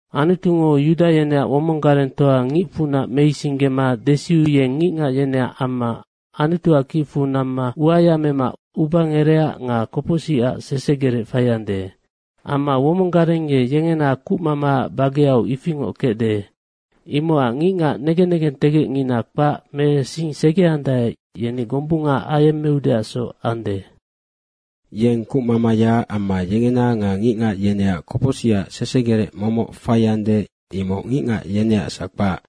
Anutungo Yuda yeneac womong garengtoa ngicfunac meisinggema desiu yeng ngicngac yeneac amma Anutuac kicfu namma uaya mema ubangerecac nga kopocsicac sesegerec faiande. Amma womong gareng ye yengena kucmamaac bageau ifingoc kecde. Imocac ngicngac negen negentegecngina kpac me sing segeandae, yeni gombunga ayemmeudeacsoc ande. Yeng kucmamayaac amma yengena nga ngicngac yeneac kopocsicac sesegerec momoc faiande, imoc ngicngac yeneacsac kpac.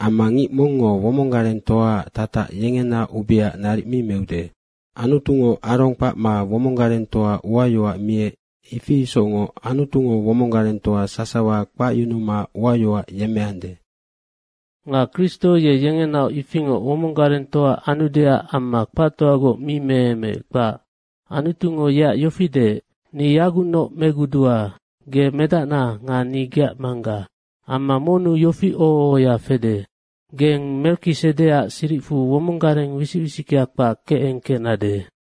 Amma ngic mongngo womong garengtoaac tatac yengena ubeaac naric mi meude. Anutungo Arong kpacma womong garengtoa uayoac miec, ifi isocngoc Anutungo womong garengtoa sasawa kpacyunuma uayoac yemmeande. Nga Kristo ye yengenaoc ifingoc womong garengtoa anudeac amma kpactoagoc mi meemeec, kpac. Anutungo yeac yofi deec, “Ni yagucnoc megudua. Ge medacna nga ni geac Mangga.” Amma monnu yofi oho ohoya fede, “Geng Merikisedeac siricfu womonggareng wisic wisickea kpac kecengkecnade.”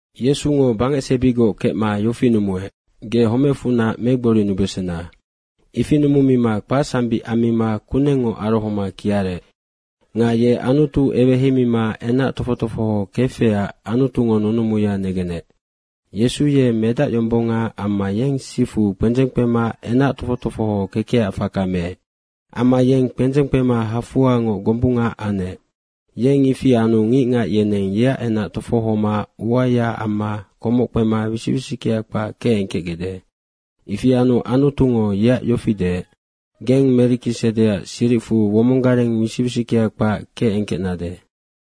Yesungo bangecsebigoc kecma yofi numuec, “Ge homecfunac megborinubesena.” Ifi numumima kpacsambic ammima kunengngoc arohoma kiarec. Nga ye Anutu eweheimima enac tofoc tofoho kefecac Anutungo nunumuya negenec. Yesu ye Medac yombonga. Amma yeng sifu kpendzeng kpema enac tofoc tofoho kekecac faka meec. Amma ye kpendzeng kpema hafoangoc gombunga anec. Yeng ifi anu ngicngac yeneng yeac enac tofohoma uayaac amma komoc kpema wisic wisickea kpac kecengkecgecde. Ifi anu Anutungo yeac yofi deec, “Geng Merikisedeac siricfu womonggareng wisic wisickea kpac kecengkecnade.”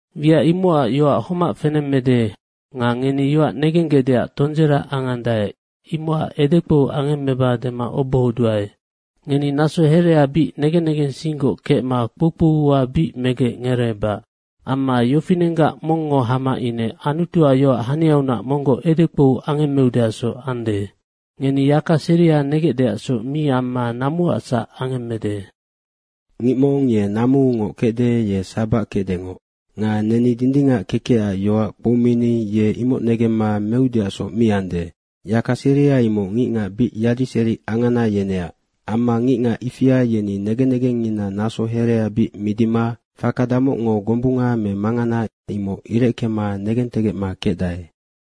Wiac imocac yoac homac fenemmede nga ngeni yoac negenggecdeac tondzera angandae, imocac edekpou angemmeba dema obohoduae. Ngeni naso herea bic negen negensinggoc kecma kpoukpou ua bic megec ngereebac. Amma yofinenggac mongngo hama ine Anutuac yoac haniaunac monggoc edekpou angemmeudesoc ande. Ngeni yaka seria negecdeacsoc mi amma namuacsac angemmede. Nga ngic mong ye namuungoc kecde, ye sabac kecdengoc. Nga neni dindingac kekecac yoac kpoumini ye imoc negemma meudeacsoc mi ande. Yaka seria imoc ngicngac bic yadiseri angana, yeneac. Amma ngicngac ifia yeni negen negengngina naso herea bic midima faka damocngo gombunga me mangana, imoc ireckema negentegecma kecdae.